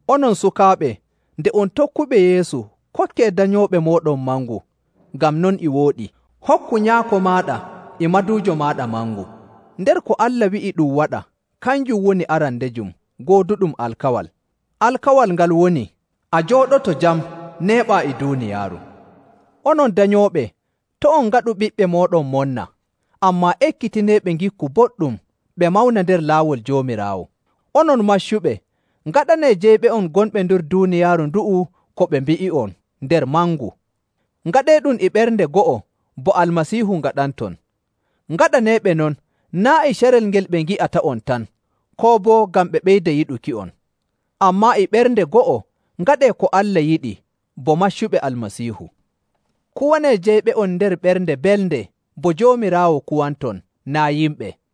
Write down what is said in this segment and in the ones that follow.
Onon sukaaɓe, nde on tokkuɓe Yeesu, kokkee danyooɓe mooɗon mangu, ngam non e wooɗi.. “Hokku nyaako maaɗa e maduujo maaɗa mangu.” Nder ko Allah wi'i ɗum waɗa, kanjum woni arandejum gooduɗum alkawal. Alkawal ngal woni, “A jooɗoto jam, neeɓaa e duuniyaaru.”. Onon danyooɓe, to' on ngaɗu ɓiɓɓe mooɗon monna, ammaa ekkitineeɓe ngikku boɗɗum ɓe mawna nder laawol Joomiraawo.. Onon maccuɓe, ngaɗanee jeyɓe'on gonɓe nder duuniyaaru ndu'u ko ɓe mbi'i'on nder mangu. Ngaɗeeɗum e ɓernde go'o bo Almasiihu ngaɗanton. Ngaɗaneeɓe non naa' e carel ngel ɓe ngi'ata'on tan, koo boo ngam ɓe ɓeyda yiɗuki'on. Ammaa e ɓernde go'o ngaɗee ko Allah yiɗi bo maccuɓe Almasiihu. Kuwanee jeyɓe'on nder ɓernde belnde bo Joomiraawo kuwanton, naa' yimɓe.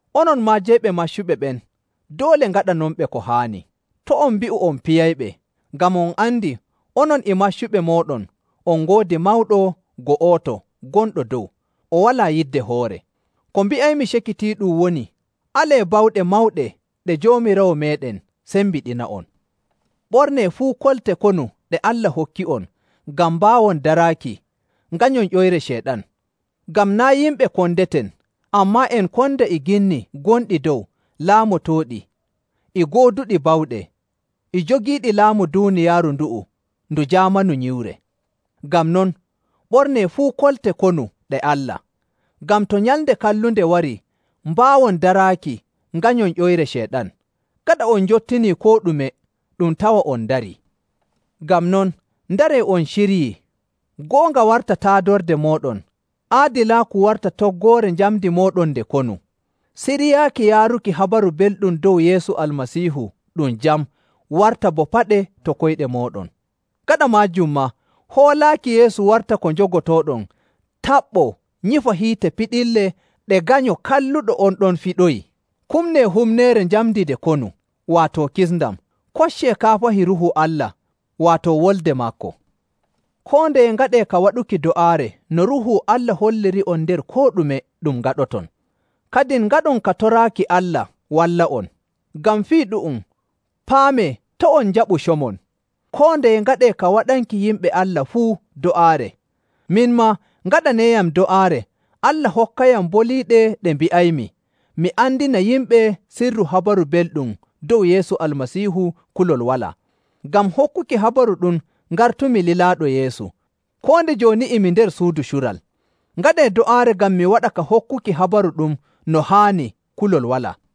Onon maa jeyɓe maccuɓe ɓen, doole ngaɗanonɓe ko haani. To' on mbi'u on piyayɓe, ngam on andi onon e maccuɓe mooɗon on ngoodi mawɗo go'oto gonɗo dow, o walaa yidde hoore.. Ko mbi'aymi cakitiiɗum woni alee bawɗe mawɗe ɗe Joomiraawo meeɗen sembiɗina'on. Ɓornee fuu kolte konu ɗe Allah hokki'on ngam mbaawon daraaki, nganyon ƴoyre Ceyɗan. Ngam naa' yimɓe kondeten, ammaa en konda e ginni gonɗi dow, laamotooɗi, e gooduɗi bawɗe, e jogiiɗi laamu duuniyaaru ndu'u ndu jaamanu nyiwre. Ngam non, ɓornee fuu kolte konu ɗe Allah, ngam to nyalnde kallunde warii, mbaawon daraaki nganyon ƴoyre Ceyɗan. Gaɗa on njottinii koo ɗume, ɗum tawa on ndarii. Ngam non, ndaree on ciryii. Goonga warta taadorde mooɗon, aadilaaku warta toggoore njamndi mooɗon nde konu.. Siryaaki yaaruki Habaru Belɗum dow Yeesu Almasiihu ɗum jam warta bo paɗe to koyɗe mooɗon.. Gaɗa maajum maa, hoolaaki Yeesu warta ko njogotooɗon taɓɓoo nyifa hiite piɗille ɗe ganyo kalluɗo on ɗon fiɗoyi. Kumnee humneere njamndi nde konu, waato kisndam. Koccee kaafahi Ruuhu Allah, waato Wolde maako.. Koo ndeye ngaɗee ka waɗuki do'aare no Ruuhu Allah holliri'on nder koo ɗume ɗum ngaɗoton. Kadin ngaɗon ka toraaki Allah walla'on. Ngam fii ɗu'um, paamee, to' on njaɓu comon, koo ndeye ngaɗee ka waɗanki yimɓe Allah fuu do'aare. Min maa, ngaɗaneeyam do'aare Allah hokkayam boliiɗe ɗe mbi'aymi, mi andina yimɓe sirru Habaru Belɗum dow Yeesu Almasiihu kulol walaa. Ngam hokkuki Habaru ɗum ngartumi lilaaɗo Yeesu, koo nde jooni e mi nder suudu cural. Ngaɗee do'aare ngam mi waɗa ka hokkuki Habaru ɗum no haani kulol walaa.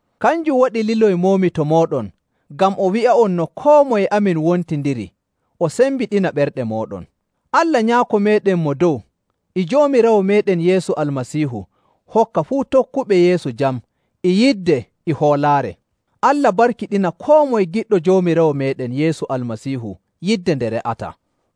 Kanjum waɗi liloymoomi to mooɗon, ngam o wi'a'on no koo moye amin wontindiri o sembiɗina ɓerɗe mooɗon.. Allah Nyaako meeɗen Mo Dow e Joomiraawo meeɗen Yeesu Almasiihu hokka fuu tokkuɓe Yeesu jam e yidde e hoolaare. Allah barkiɗina koo moye giɗɗo Joomiraawo meeɗen Yeesu Almasiihu yidde nde re'ataa.